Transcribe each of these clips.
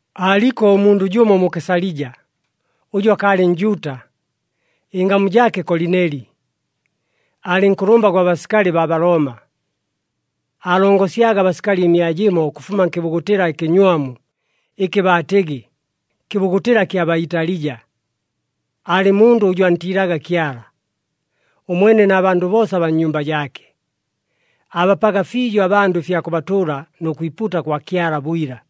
Aaliko ʉmundʉ jʉmo mu Kesalija, ʉjʉ akaalɨ Njuuta, ɨngamu jaake Kolineli. Aalɨ nkʉlʉmba gwa basikali baa Balooma. Aalongosyaga abasikali ɨmia jɨmo ʉkʉfuma nkɨbugutɨla ɨkɨnywamu ɨkɨ baatɨgɨ, Kɨbugutɨla kya baa Italija. Aalɨ mundʉ ʉjʉ antiilaga Kyala, ʉmwene na bandʉ boosa abaa nnyumba jaake. Aabapaga fiijo abandʉ ɨfya kʉbatʉʉla nʉ kwipuuta kwa Kyala bwila.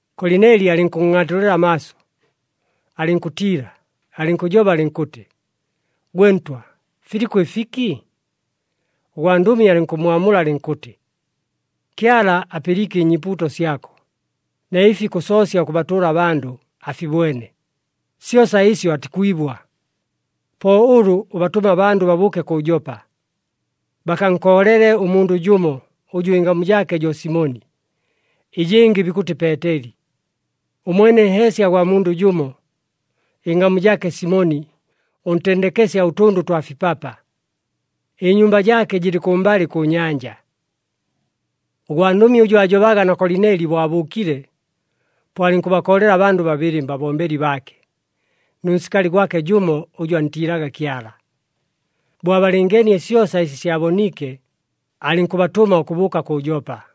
Kolineli alɨnkʉnngʼaatulɨla amaaso, alɨnkʉtiila, alɨnkʉjoba alɨnkʉtɨ, “Gwe ntwa, filiko ɨfiki?” Ʉgwandʉmi alɨnkʉmmwamula alɨnkʉtɨ, “Kyala apɨliike ɨnyiipuuto syako, na ɨfi kʉsoosya ʉkʉbatʉʉla abandʉ afibwene, syosa ɨsyo atikwibwa. Po ʉlʉ ʉbatʉme abandʉ babʉʉke kʉ Jopa, bakankoolele ʉmundʉ jʉmo, ʉjʉ ɨngamu jaake jo Simoni, ɨjɨngɨ bikʉtɨ Peeteli. Ʉmwene nheesya gwa mundʉ jʉmo, ɨngamu jaake Simoni, ʉntendekesya ʉtʉndʉ twa fipapa. Ɨnyumba jaake jɨlɨ kʉmbalɨ kʉ nyanja.” Ʉgwandʉmi ʉjʉ aajobaga na Kolineli bo abʉʉkile, po alɨnkʉbakoolela abandʉ babɨlɨ mbabombeli baake, nʉ nsikali gwake jʉmo ʉjʉ antiilaga Kyala. Bo abalɨngeenie syosa ɨsi syaboniike, alɨnkʉbatʉma ʉkʉbʉʉka kʉ Jopa.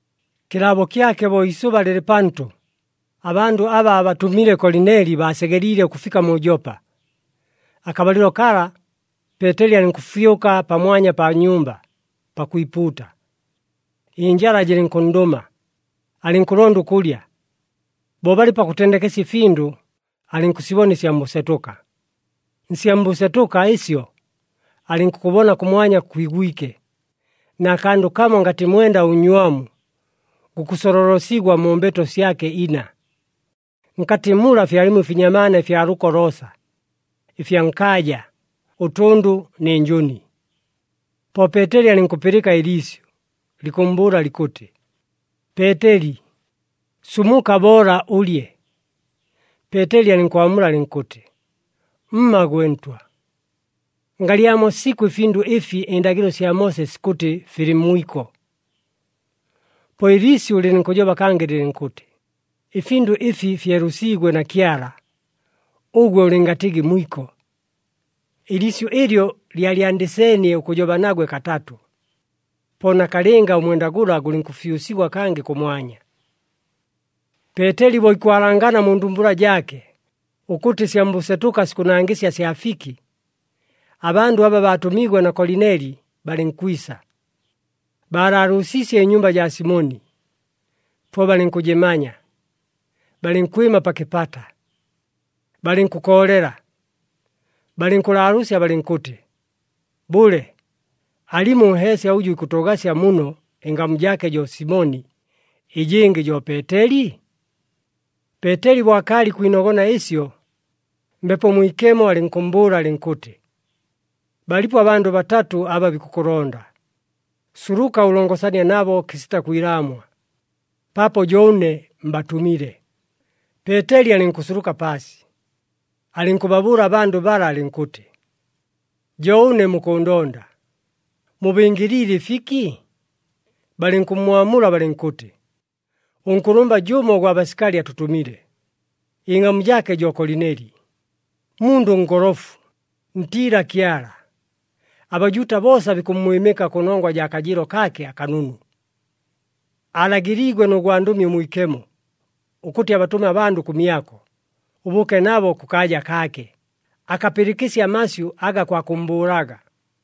Kɨlaabo kyake bo iisʉba lɨlɨ pantʉ, abandʉ aba aabatʉmile Kolineli baasegeliile ʉkʉfika mu Jopa. Akabalɨlo kala, Peeteli alɨnkʉfyʉka pamwanya pa nyumba, pakwipuuta. Ɨnjala jɨlɨnkʉnndʉma, alɨnkʉlonda ʉkʉlya. Bo balɨ pakʉtendekesya ɨfindʉ, alɨnkʉsibona ɨsya mbʉsetʉka. Nsya mbʉsetʉka ɨsyo, alɨnkʉkʉbona kʉmwanya kwigwike, na kandʉ kamo ngatɨ mwenda ʉnnywamu, gukʉsololosigwa mu mbeto syake ina. Nkatɨ mula fyalimo ɨfinyamaana ɨfya lʉko loosa, ɨfya nkaaja, ʉtʉndʉ nɨ njʉni. Po Peeteli alɨnkʉpɨlɨka ɨliisyʉ, likʉmmbʉʉla likʉtɨ, “Peeteli, sumuka! Boola ʉlye!” Peeteli alɨnkwamula alɨnkʉtɨ, “Mma gwe Ntwa! Ngalyamo sikʉ ɨfindʉ ɨfi ɨndagɨlo sya Moose sikʉtɨ filɨ mwiko!” Po ɨliisyʉ lɨlɨnkʉjoba kangɨ lɨlɨnkʉtɨ, “Ɨfindʉ ɨfi fyelʉsiigwe na Kyala, ʉgwe ʉlɨngatɨgɨ mwiko.” Ɨliisyʉ ɨlyo lyalyandɨseenie ʉkʉjoba nagwe katatʉ, po nakalɨnga ʉmwenda gʉla gʉlɨnkʉfyʉsigwa kangɨ kʉmwanya. Peeteli bo ikwalangana mu ndumbula jaake ʉkʉtɨ ɨsya mbʉsetʉka sikʉnangɨsya sya fiki, abandʉ aba baatʉmiigwe na Kolineli, balɨnkwisa. Baalaalʉʉsiisye ɨnyumba jaa Simoni, po balɨnkʉjɨmanya, balɨnkwɨma pa kɨpata. Balɨnkʉkoolela, balɨnkʉlaalʉʉsya balɨnkʉtɨ, “Bʉle, alimo ʉnheesya ʉjʉ ikʉtʉʉgasya muno, ɨngamu jaake jo Simoni, ɨjɨngɨ jo Peeteli?” Peeteli bo akaalɨ ikwinogona ɨsyo, Mbepo Mwikemo alɨnkʉmmbʉʉla alɨnkʉtɨ, “Balipo abandʉ batatʉ aba bikʉkʉlonda. Suluka, ʉlongosanie nabo kɨsita kwilaamwa, paapo jo ʉne mbatʉmile.” Peeteli alɨnkʉsuluka paasi, alɨnkʉbabʉʉla abandʉ bala alɨnkʉtɨ, “Jo ʉne mukʉʉndonda. Mubɨngɨliile ɨfiki?” Balɨnkʉmmwamula balɨnkʉtɨ, “Ʉnkʉlʉmba jʉmo ʉgwa basikali atʉtʉmile. Ɨngamu jaake jo Kolineli, mundʉ ngolofu, ntiila Kyala, aBajuuta boosa bikʉmmwɨmɨka kʉnongwa jaa kajɨɨlo kaake akanunu. Alagɨliigwe nʉ gwandʉmi ʉmwikemo, ʉkʉtɨ abatʉme abandʉ kʉmyako, ʉbʉʉke nabo kʉkaaja kaake, akapɨlɨkɨsye amasyʉ aga kwa kʉmmbʉʉlaga.”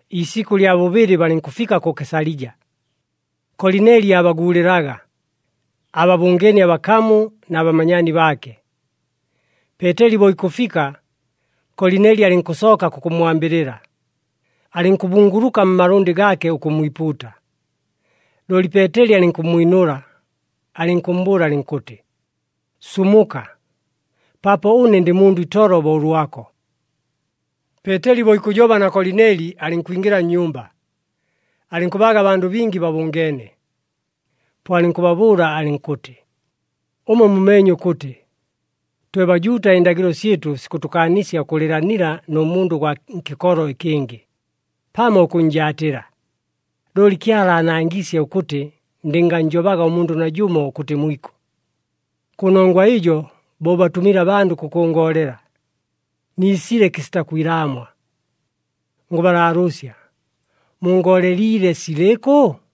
Iisikʉ lya bʉbɨlɨ balɨnkʉfika kʉ Kesalija. Kolineli aabaguulɨlaga, aababʉngeenie abakamu na bamanyaani baake. Peeteli bo ikʉfika, Kolineli alɨnkʉsooka kʉkʉmmwambɨlɨla, alɨnkʉbunguluka mmalʉndɨ gaake ʉkʉmmwipuuta. Looli Peeteli alɨnkʉmmwinʉla, alɨnkʉmmbʉʉla alɨnkʉtɨ, “Sumuka! Paapo ʉne ndɨ mundʉ itolo bo ʉlwako!” Peeteli bo ikʉjoba na Kolineli, alɨnkwingɨla nnyumba, alɨnkʉbaaga abandʉ bingi babʉngeene. Po alɨnkʉbabʉʉla alɨnkʉtɨ, “Ʉmwe mumeenye ʉkʉtɨ, twe Bajuuta ɨndagɨlo syɨtʉ sikʉtʉkaanisya ʉkʉlɨɨlanila nʉ mundʉ ʉgwa nkɨkolo ɨkɨngɨ, pamo ʉkʉnnjaatɨla. Looli Kyala aanangiisye ʉkʉtɨ ndɨngannjobaga ʉmundʉ najʉmo ʉkʉtɨ mwiko. Kʉnongwa ɨjo, bo ʉbatʉmile abandʉ kʉkʉngoolela, niisile kɨsita kwilaamwa. Ngʉbalaalʉʉsya mungooleliile silɨkʉ?”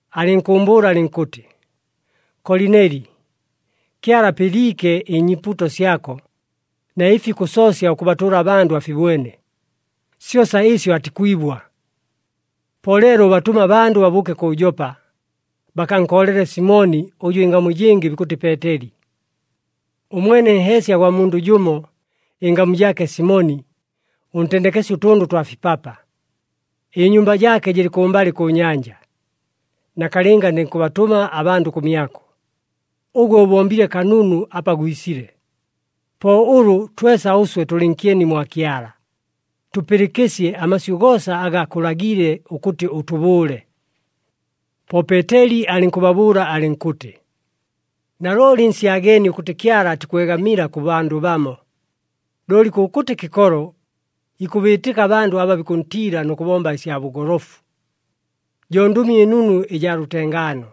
alɨnkʉʉmbʉʉla alɨnkʉtɨ, ‘Kolineli, Kyala apɨliike ɨnyiipuuto syako, na ɨfi kʉsoosya ʉkʉbatʉʉla abandʉ afibwene, syosa ɨsyo atikwibwa. Po leelo, ʉbatʉme abandʉ babʉʉke kʉ Jopa, bakankoolele Simoni, ʉjʉ ɨngamu ɨjɨngɨ bikʉtɨ Peeteli. Ʉmwene nheesya gwa mundʉ jʉmo, ɨngamu jaake Simoni, ʉntendekesya ʉtʉndʉ twa fipapa. Ɨnyumba jaake jɨlɨ kʉmbalɨ kʉ nyanja.’ Nakalɨnga ndɨnkʉbatʉma abandʉ kʉmyako, ʉgwe ʉbombile kanunu apa gwisile. Po ʉlʉ twesa ʉswe tʉlɨ nkyeni mwa Kyala, tʉpɨlɨkɨsye amasyʉ goosa aga akʉlagiile ʉkʉtɨ ʉtʉbʉʉle.” Po Peeteli alɨnkʉbabʉʉla alɨnkʉtɨ, “Nalooli nsyageenie ʉkʉtɨ Kyala atikwegamila kʉ bandʉ bamo! Looli kʉkʉtɨ kɨkolo, ikʉbiitɨka abandʉ aba bikʉntiila nʉ kʉbomba ɨsya bʉgolofu. Jo Ndʉmi ɨNunu ɨjaa lʉtengaano,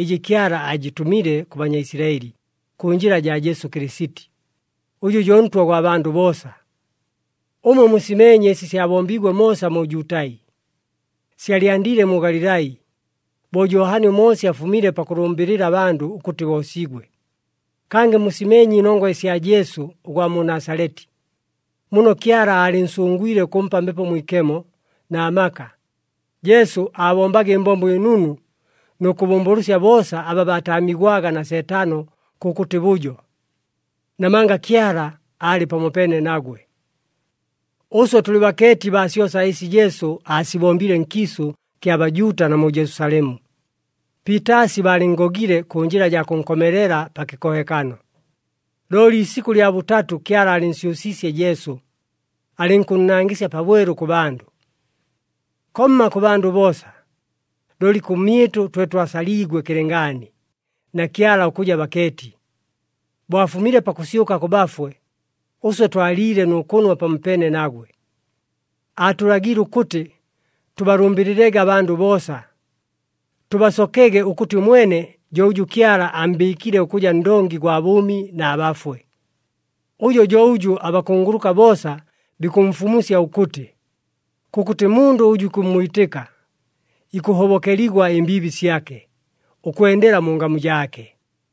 ɨjɨ Kyala aajɨtʉmile kʉ Banyaisilaɨli kʉ njɨla jaa Jesu Kɨlɨsiti, ʉjʉ jo Ntwa gwa bandʉ boosa. Ʉmwe musimeenye ɨsi syabombiigwe moosa mu Jutai, syalyandiile mu Galilai, bo Johani ʉMoosi afumile pakʉlʉmbɨlɨla abandʉ ʉkʉtɨ boosigwe. Kangɨ musimeenye ɨnongwa ɨsya Jesu ʉgwa mu Nasaleti, muno Kyala aalɨnsʉngwile ʉkʉmpa Mbepo Mwikemo na maka. Jesu aabombaga ɨmbombo ɨnunu nʉ kʉbʉmbʉlʉsya boosa aba baataamigwaga na Seetano kʉkʉtɨ bʉjo. Namanga Kyala aalɨ pamopeene nagwe. “Ʉswe tʉlɨ bakeeti baa syosa ɨsi Jesu aasibombile nkiisʉ kya Bajuuta na mu Jelusalemu. Piitaasi baalɨnngogile kʉ njɨla jaa kʉnkomelela pa kɨkohekano. Looli iisikʉ lya bʉtatʉ Kyala aalɨnsyʉsiisye Jesu, alɨnkʉnnangɨsya pabwelu kʉ bandʉ. Komma kʉ bandʉ boosa, looli kʉmyɨtʉ twe twasaliigwe kɨlɨngaani na Kyala ʉkʉja bakeeti. Bo afumile pakʉsyʉka kʉ bafwe, ʉswe twaliile nʉ kʉnwa pamopeene nagwe. Aatʉlagiile ʉkʉtɨ tʉbalʉmbɨlɨlege abandʉ boosa, tʉbasokege ʉkʉtɨ ʉmwene jo ʉjʉ Kyala ammbɨɨkile ʉkʉja Ndongi gwa bʉʉmi na bafwe. Ʉjo jo ʉjʉ abakunguluka boosa bikʉmfumusya ʉkʉtɨ, kʉkʉtɨ mundʉ ʉjʉ ikʉmmwitɨka, ikʉhobokeligwa ɨmbiibi syake, ʉkwendela mu ngamu jaake.”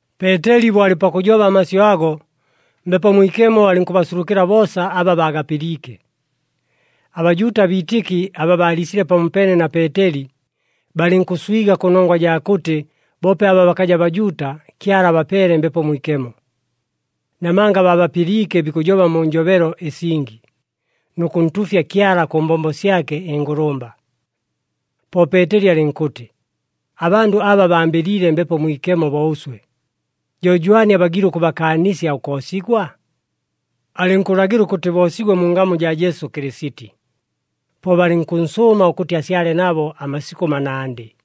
Peeteli bo alɨ pakʉjoba amasyʉ ago, Mbepo Mwikemo alɨnkʉbasulukɨla boosa aba baagapɨliike. ABajuuta abiitɨki aba baaliisile pamopeene na Peeteli, balɨnkʉswiga kʉnongwa jaa kʉtɨ boope aba bakaja Bajuuta, Kyala abapeele Mbepo Mwikemo. Namanga baabapɨliike bikʉjoba mu njobelo ɨsingi, nʉ kʉntuufya Kyala kʉ mbombo syake ɨngʉlʉmba. Po Peeteli alɨnkʉtɨ, “Abandʉ aba bambɨliile Mbepo Mwikemo bo ʉswe. Jo jwani abagiile ʉkʉbakaanisya ʉkoosigwa?” Alɨnkʉlagɨla ʉkʉtɨ boosigwe mu ngamu jaa Jesu Kɨlɨsiti. Po balɨnkʉnsʉʉma ʉkʉtɨ asyale nabo amasikʉ manandɨ.